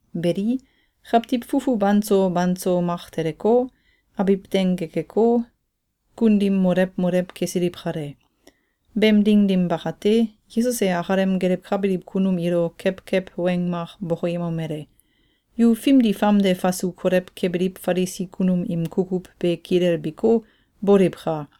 Beli, kawtiw fufu banso banso mak teleko, abiw deng gekeko, kun dim molew molew kesiliw kale. Beem ding dim bakate, Yesus e akalem gelewkabiliw kunum ilo kewkew weng mak bokoyemomele: “Yu fimdi famde fasu kolew kebiliw Falisi kunum im kukuw be kilelbiko, boliwka!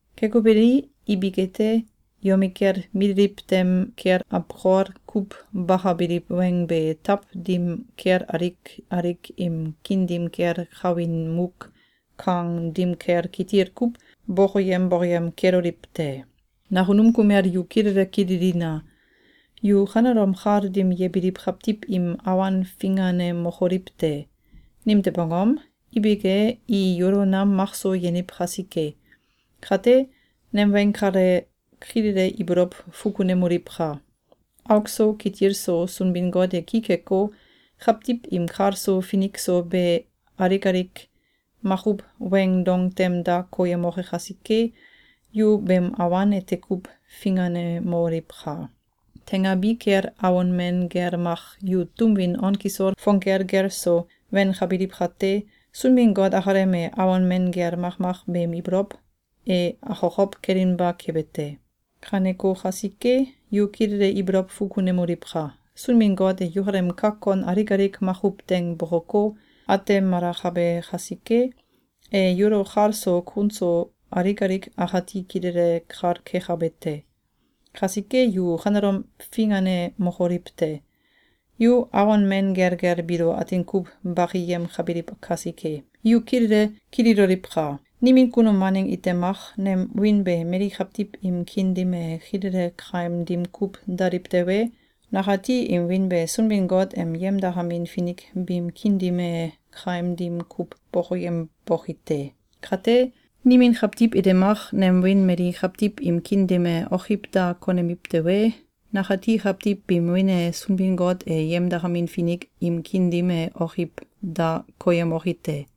Keko beli, ibik ete, yomikel mililiw tem kel awkol kuw bakabiliw weng be taw dim kel alik alik im kiin dim kel kawin muk kang dim kel kitil kuw bokoyem bokoyem keloliw te. Nakunum kumel yu kilele kililina! Yu kanelom kal dim yebiliw kawtiw im awan finganemokoliw te! Nimtew angom? Ibik e, i yulo nam makso yeniw kasike. Kate, nem weng kale kilele ibolow fukunemoliwka! Auk so kitil so Sunbin-Got e ki keko, kawtiw im kal so finik so be alik alik makuw weing dong tem da koyemoke kasike, yu beem awan ete kuw finganemoliwka! Teingabi kel awon men gel mak yu tum win on kisol fong gelgel so wenkabiliw kate, Sunbin-Got akalem e awon men gel makmak beem ibolow e akokow kelinba kebe te. Kaneko kasike, yu kilele ibolow fukunemoliwka! Sunbin-Got e yukalem kak kon alik alik makuw teing bokoko, atemalakabe kasike, e yulo kal so kun so alik alik akati kilele kal kekabe te. Kasike, yu kanelom finganemokoliw te. Yu awon men gelgel biilo atin kuw bakiyemkabiliw kasike. Yu kilele kililoliwka! Nimin kunum waneng ite mak nem wiin be mali kawtiw im kiin dim e kilele kaim dim kuw daliw tewe, nakati im wiin be Sunbin-Got em yemdakamin finik biim kiin dim e kaim dim kuw bokoyemboki te. Kate, nimin kawtiw ite mak nem wiin mali kawtiw im kiin dim e okiw da konemiw tewe, nakati kawtiw biim wiin e Sunbin-Got em yemdakamin finik im kiin dim e okiw da koyemoki te.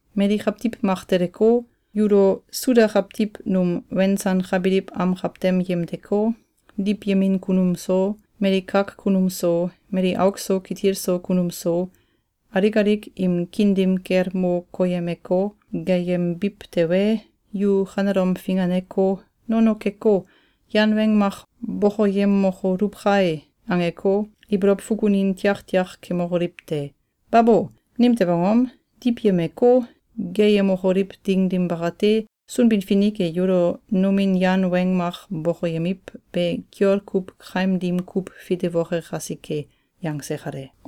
Mali kawtiw mak teleko, yulo Suda kawtiw num wensankabiliw am kawtem yemdeko, diwyemin kunum so, mali kak kunum so, mali auk so kitil so kunum so, alik alik im kiin dim kel mo koyemeko, geeyembiw tewe, yu kanelom finganeko, ‘Nono keko, yan weng mak bokoyemokoluw kae!’, angeko, ibolow fukunin tiaktiak kemokoliw te! Babo! Nimtew angom? Diwyemeko, geeyemokoliw ding dim bakate, Sunbin-Finik e yulo nomin yan weng mak bokoyemiw be kiol kuw kaim dim kuw fitewoke kasike.”, yangse kale.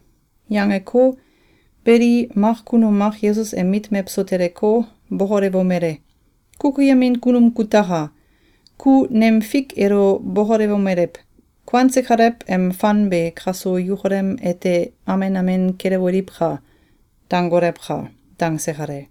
Yangeko, beli, mak kunum mak Yesus em mit mewso teleko, bokolewomele: “Kukuyemin kunum kutaka! Ku nem fik elo bokolewomelew: ‘Kuanse kalew em fan be kaso yukalem ete amen amen kelewoliwka!’, dangolewka!”, dangse kale.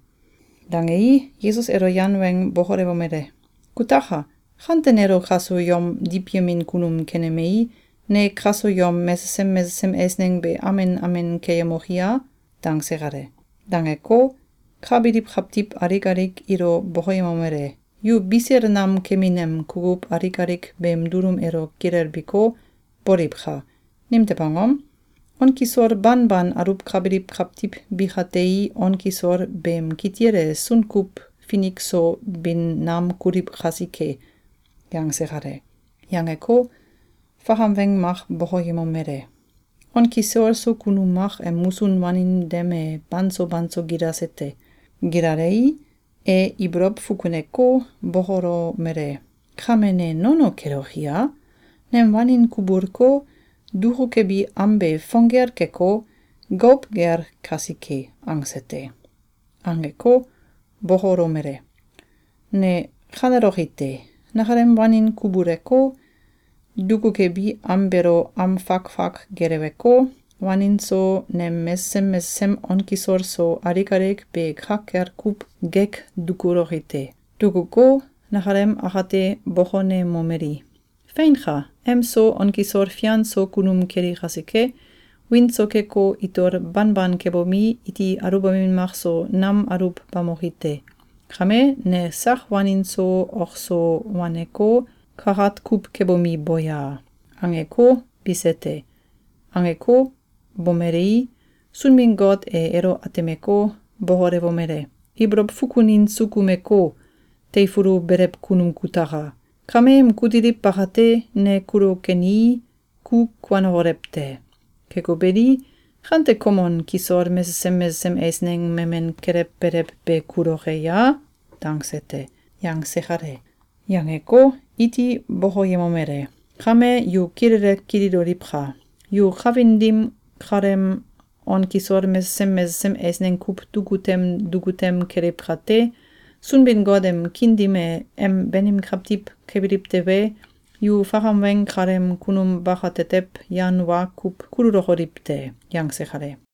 Dangei, Yesus elo yan weng bokolewomele: “Kutaka! Kante nelo kaso yom diwyemin kunum kenemei, ne kaso yom mesesem mesesem eisneng be amen amen keyemoki a?”, dangse kale. Dangeko, ka biliw kawtiw alik alik ilo bokoyemomele: “Yu bisil nam kemin em kukuw alik alik beem dulum elo kilelbiko, boliwka! Nimtew angom? On kisol banban aluwkabiliw kawtiw bikatei on kisol beem kitil e sunkuw finik so bin nam kuliw kasike.”, yangse kale. Yangeko, fakam weng mak bokoyemomele: “On kisol so kunum mak em musun wanin dem e banso banso gilase te. Gilalei, e ibolow fukuneko, bokolomele: ‘Kame ne nono keloki a? Nem wanin kubulko, dukukebi am be fong gel keko, gouw gel kasike!’, angse te. Angeko, bokolomele: ‘Ne kaneloki te! Nakalem wanin kubuleko, dukukebi am beelo am fak fak geleweko, wanin so, nem mesesem mesesem on kisol so alik alik be ka kel kuw gek dukuloki te. Dukuko, nakalem akate bokonemomeli: ‘Feinka! Em so, on kisol fian so kunum keli kasike, wiin so keko, itol banban kebomi, iti aluwbamin makso nam aluwbamoki te. Kame, ne sak wanin so ok so waneko, kakat kuw kebomi, bo ya!’, angeko, bise te. Angeko, bomelei, Sunbin-Got e elo atemeko, bokolewomele: ‘Ibolow fukunin sukumeko, teifulu belew kunum kutaka! Kameem kutiliw bakate, ne kulo kenii, ku kuanokolew te. Keko beli, kante kom on kisol mesesem mesesem eisneng memen kelewbelew be kuloke ya?’, dangse te.”, yangse kale. Yangeko, iti bokoyemomele: “Kame, yu kilele kililoliwka! Yu kawin dim kaleem on kisol mesesem mesesem eisneng kuw duku tem duku tem keliw kate, Sunbin-Got em kiin dim e em banim kawtiw kebiliw tewe, yu fakam weng kaleem kunum bakatetew yan wa kuw kululokoliw te.”, yangse kale.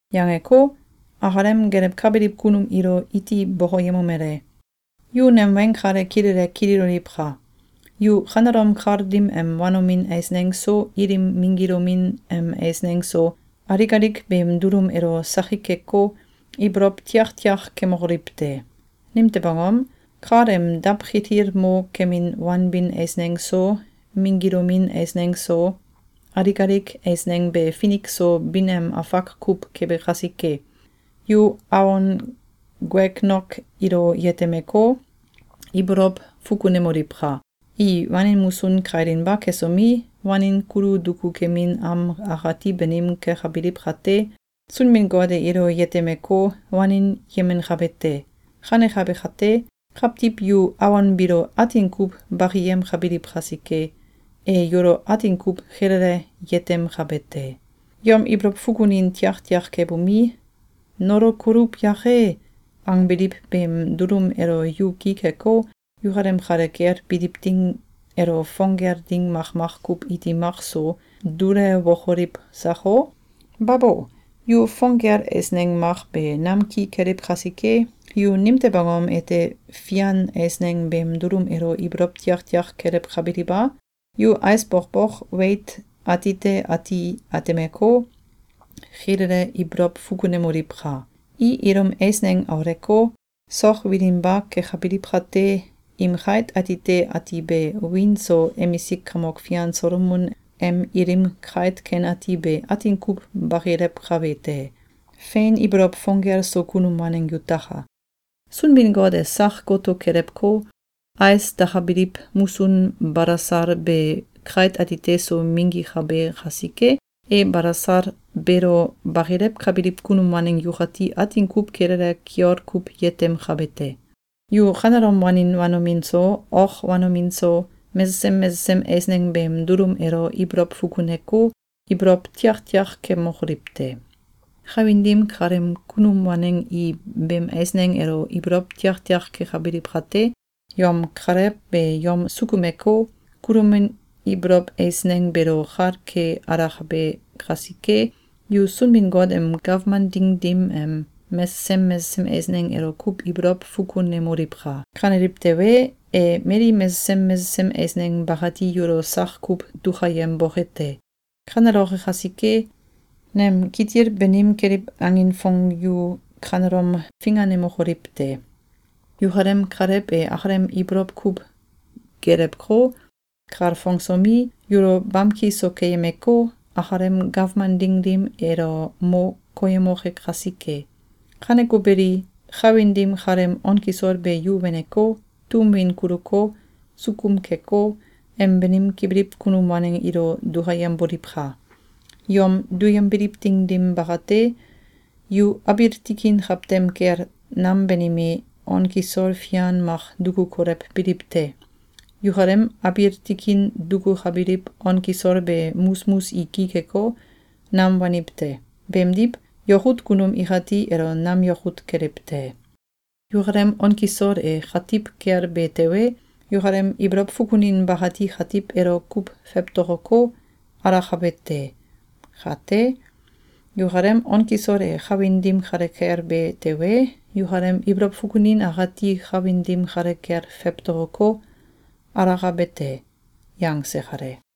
Yangeko, akalem gelewkabiliw kunum ilo iti bokoyemomele: “Yu nem weng kale kilele kililoliwka! Yu kanelom kal dim em wanomin eisneng so, ilim minggilomin em eisneng so, alik alik beem dulum elo sakik keko, ibolow tiaktiak kemokoliw te! Nimtew angom? Kal em dawkitil mo kemin wanbin eisneng so, minggilomin eisneng so, alik alik eisneng be finik so bin em afak kuw kebe kasike. Yu awon guegnok ilo yetemeko, ibolow fukunemoliwka! I wanin musun kailinba kesomi, wanin kulu duku kemin am akati banim kekabiliw kate, Sunbin-Got e ilo yetemeko, wanin yemenkabe te. Kanekabe kate, kawtiw yu awon biilo atin kuw bakiyemkabiliw kasike, e yulo atin kuw kilele yetemkabe te. Yom ibolow fukunin tiaktiak kebomi, ‘Nolokoluw yake!’, angbiliw beem dulum elo yu ki keko, yukalem kale kel biliw ding elo fong gel ding makmak kuw iti makso dulewokoliw sako? Babo! Yu fong gel eisneng mak be nam ki keliw kasike, yu nimtew angom ete fian eisneng beem dulum elo ibolow tiaktiak kelewkabiliw a? Yu ais bokbok weit atite ati atemeko, kilele ibolow fukunemoliwka! I ilum eisneng auleko, sok wilinba kekabiliw kate, im kait atite ati be wiin so emisik kamok fian Solomon em ilim kait ken ati be atin kuw bakilewkabe te. Fein ibolow fong gel so kunum waneng yutaka! Sunbin-Got e sak goto kelewko, ais dakabiliw musun balasal be kait atite so minggikabe kasike, e balasal beelo bakilewkabiliw kunum waneng yukati atin kuw kilele kiol kuw yetemkabe te! Yu kanelom wanin wanomin so, ok wanomin so, mesesem mesesem eisneng beem dulum elo ibolow fukuneko, ibolow tiaktiak kemokoliw te! Kawin dim kaleem kunum waneng i beem eisneng elo ibolow tiaktiak kekabiliw kate, yom Kalew be yom sukumeko, kulomin ibolow eisneng beelo kal ke alakabe kasike, yu Sunbin-Got em gawman ding dim em mesesem mesesem eisneng elo kuw ibolow fukunemoliwka! Kaneliw tewe, e mali mesesem mesesem eisneng bakati yulo sak kuw dukayemboke te. Kaneloke kasike, nem kitil banim keliw angin fong yu kanelom finganemokoliw te! Yukalem Kalew e akalem ibolow kuw gelewko, kalfongsomi, yulo bamki so keyemeko, akalem gawman ding dim elo mo koyemoke kasike. Kaneko beli, kawin dim kaleem on kisol be yu weneko, tum win kuluko, sukum keko, em banim kebiliw kunum waneng ilo dukayemboliwka! Yom duyembiliw ding dim bakate, yu abiil tikin kawtem kel nam banime on kisol fian mak duku kolewbiliw te. Yukalem abiil tikin dukukabiliw on kisol be musmus i ki keko, nam waniw te. Beemdiw, yakut kunum ikati elo nam yakut keliw te. Yukalem on kisol e katiw kel be tewe, yukalem ibolow fukunin bakati katiw elo kuw fewtokoko, alakabe te. Kate, yukalem on kisol e kawin dim kale kel be tewe, yukalem ibolow fukunin akati kawin dim kale kel fewtokoko, alakabe te.”, yangse kale.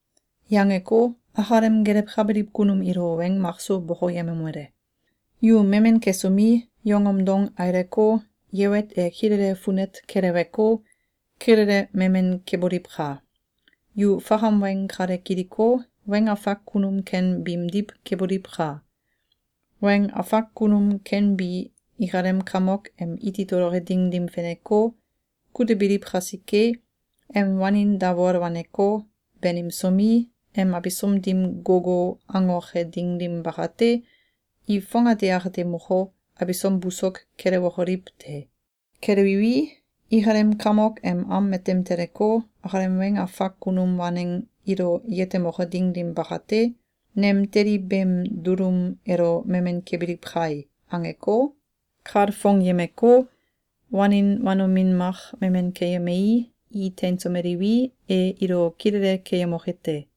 Yangeko, akalem gelewkabiliw kunum ilo weng makso bokoyemomele: “Yu memen kesomi, yongom dong aileko, yewet e kilele funet keleweko, kilele memen keboliwka! Yu fakam weng kale kiliko, weng afak kunum ken biimdiw keboliwka! Weng afak kunum ken bi ikalem kamok em iti toloke ding dim feneko, kutebiliw kasike, em wanin dawol waneko, banimsomi, em abisom dim gogo angoke ding dim bakate, i fongate akate moko, abisom busok kelewokoliw te. Kelewiwi, ikalem kamok em am matem teleko, akalem weng afak kunum waneng ilo yetemoke ding dim bakate, ‘Nem teli beem dulum elo memen kebiliw kai!’, angeko, kalfongyemeko, wanin wanomin mak memen keyemei, i teinsomeliwi, e ilo kilele keyemoke te.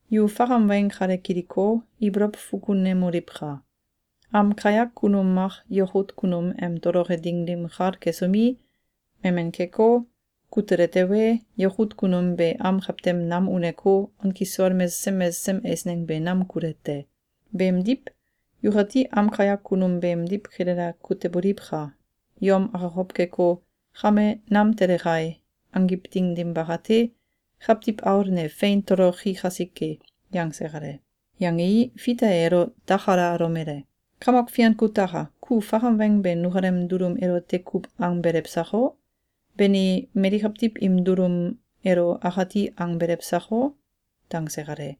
Yu fakam weng kale kiliko, ibolow fukunemoliwka! Am kayak kunum mak yakut kunum em toloke ding dim kal kesomi, memen keko, kutele tewe, yakut kunum be am kawtem nam uneko, on kisol mesesem mesesem eisneng be nam kule te. Beemdiw, yukati am kayak kunum beemdiw kilele kuteboliwka! Yom akokow keko, ‘Kame nam tele kai!’ angiw ding dim bakate, Kawtiw Aul ne fein toloki kasike.”, yangse kale. Yangei, Fita e elo dakalalomele: “Kamok Fian kutaka! Ku fakam weng be nukalem dulum elote kuw angbelew sako? Bani, mali kawtiw im dulum elo akati angbelew sako?”, dangse kale.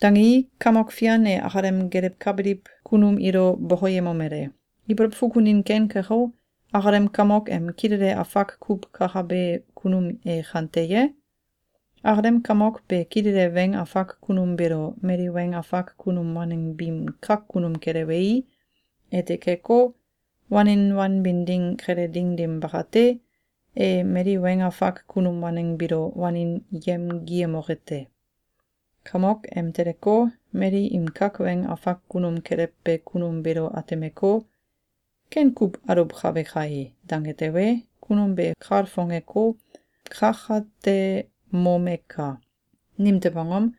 Dangei, Kamok Fian e akalem gelewkabiliw kunum ilo bokoyemomele: “Ibolow fukunin ken keko, akalem kamok em kilele afak kuw kakabe kunum e kante ye? Akalem kamok be kilele weng afak kunum beelo mali weng afak kunum waneng biim kak kunum kelewei, ete keko, wanin wanbin ding kele ding dim bakate, e mali weng afak kunum waneng biilo wanin yemgiyemoke te. Kamok em teleko, mali im kak weng afak kunum kelewbe kunum beelo atemeko, ‘Ken kuw aluwkabe kai!’, dange tewe, kunum be kalfongeko, kakatemomeka! Nimtew angom?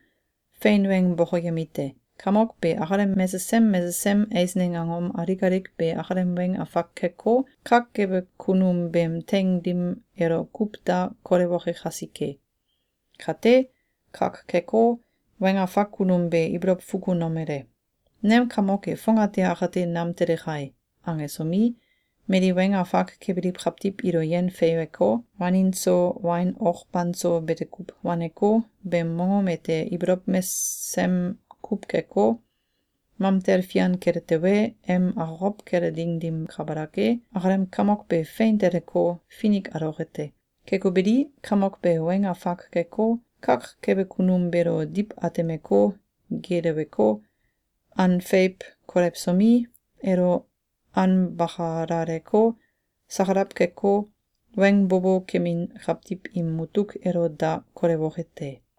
Fein weng bokoyemite: Kamok be akalem mesesem mesesem eisneng angom alik alik be akalem weng afak keko, kak kebe kunum beem teing dim elo kuw da kolewoke kasike. Kate, kak keko, weng afak kunum be ibolow fukunomele: ‘Nem kamok e fongate akate nam tele kai!’, angesomi, mali weng afak kebiliw kawtiw ilo yen feiweko, wanin so wain ok banso bete kuw waneko, beem mongom ete ibolow mesem kuw keko, mamtel fian kele tewe, em akokow kele ding dim kabalak e, akalem kamok be fein teleko, finik aloke te. Keko beli, kamok be weng afak keko, kak kebe kunum beelo diw atemeko, geeleweko, an feiw kolewsomi, elo anbakalaleko, sakalaw keko, weng bo bo kemin kawtiw im mutuk elo da kolewoke te.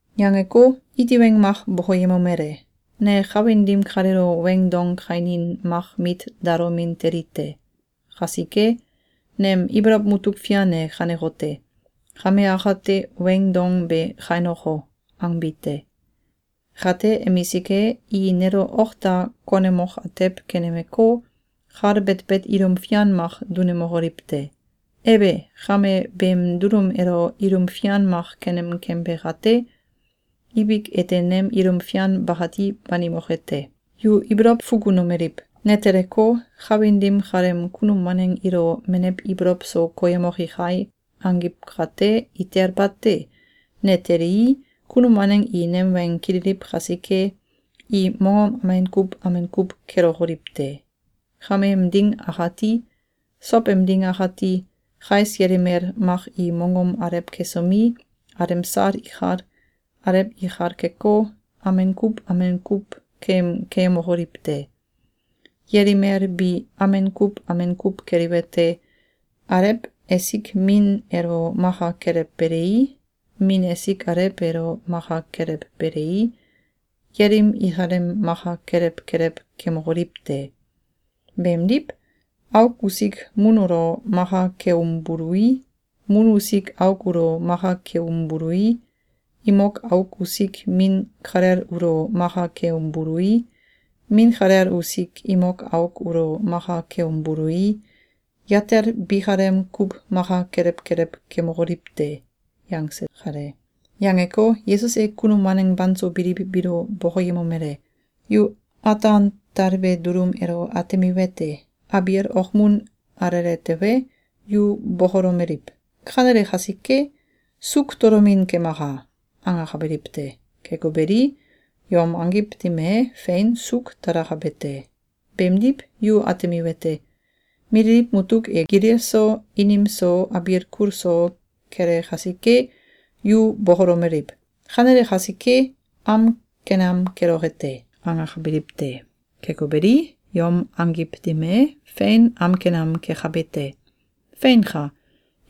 Yangeko, iti weng mak bokoyemomele: “Ne kawin dim kaleelo weing dong kainin mak mit dalomin teli te. Kasike, nem ibolow mutuk fian e kanekote: Kame akate weing dong be kainoko!’, angbi te. Kate emisik e, i nelo ok da konemok atew kenemeko, kal betbet ilum fian mak dunemokoliw te. Ebe! Kame, beem dulum elo ilum fian mak kenem kembe kate, ibik ete nem ilum fian bakati banimoke te. Yu ibolow fukunomeliw: ‘Ne teleko, kawin dim kaleem kunum waneng ilo menew ibolow so koyemoki kai!’, angiw kate, itel bate! Ne telii, kunum waneng i nem weng kililiw kasike, i mongom amen kuw amen kuw kelokoliw te. Kameem ding akati, sow em ding akati, kais yelimel mak i mongom alew kesomi, alemsal ikal, alew ikal keko, amen kuw amen kuw keem keyemokoliw te. Yelimel bi amen kuw amen kuw keliwete: Alew esik min elo maka kelewbelei, min esik alew elo maka kelewbelei, yelim ikalem maka kelew kelew kemokoliw te. Beemdiw, auk usik mun ulo maka keumbului, mun usik auk ulo maka keumbului, imok auk usik min kalel ulo maka keumbului, min kalel usik imok auk ulo maka keumbului, yatel bikalem kuw maka kelew kelew kemokoliw te.”, yangse kale. Yangeko, Yesus e kunum waneng banso biliw biilo bokoyemomele: “Yu ataan talbe dulum elo atemiwete: Abiil okmun alele tewe, yu bokolomeliw: ‘Kanele kasike, suuk tolomin kemaka!’, angakabiliw te. Keko beli, yom angiw dim e, fein suuk talakabe te. Beemdiw yu atemiwete: Mililiw mutuk e gilil so, inim so, abiil kul so, kele kasike, yu bokolomeliw: ‘Kanele kasike, am ken am keloke te!’, angakabiliw te. Keko beli, yom angiw dim e, fein am ken am kekabe te. Feinka!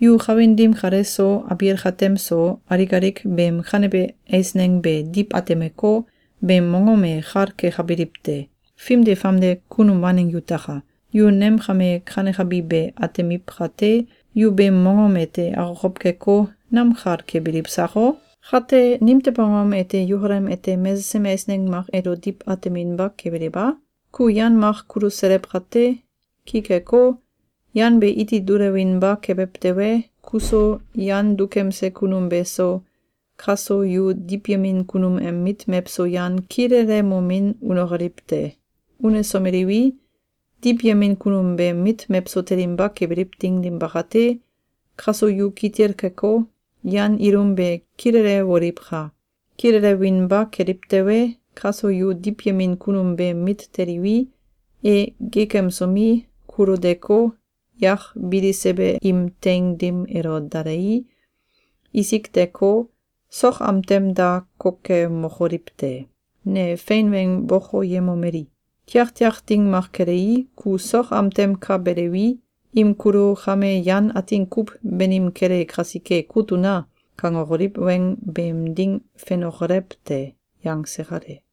Yu kawin dim kale so, abiil katem so, alik alik beem kanebe eisneng be diw atemeko, beem mongom e kal kekabiliw te. Fimdi famde kunum waneng yutaka! Yu nem kame kanekabi be atemiw kate, yu beem mongom ete akokow keko, nam kal kebiliw sako? Kate nimtew angom ete yukalem ete mesesem eisneng mak elo diw ateminba kebiliw a? Ku yan mak kuluselew kate, ki keko, yan be iti dulewinba kebew tewe, kuso, yan dukemse kunum beso, kaso yu diwyemin kunum em mit mewso yan kilelemomin unokoliw te. Unesomeliwi, diwyemin kunum beem mit mewso telinba kebiliw ding dim bakate, kaso yu kitil keko, yan ilum be kilelewoliwka! Kilelewinba keliw tewe, kaso yu diwyemin kunum beem mit teliwi, e geekemsomi, kulo deko, yak bilisebe im teing dim elo dalei, isik deko, sok am tem da kokemokoliw te. Ne fein weng bokoyemomeli: Tiaktiak ding mak kelei, ku sok am tem ka belewi, im kulo ‘Kame yan atin kuw banim kele kasike, kut una!’, kangokoliw weng beem ding fenokolew te.”, yangse kale.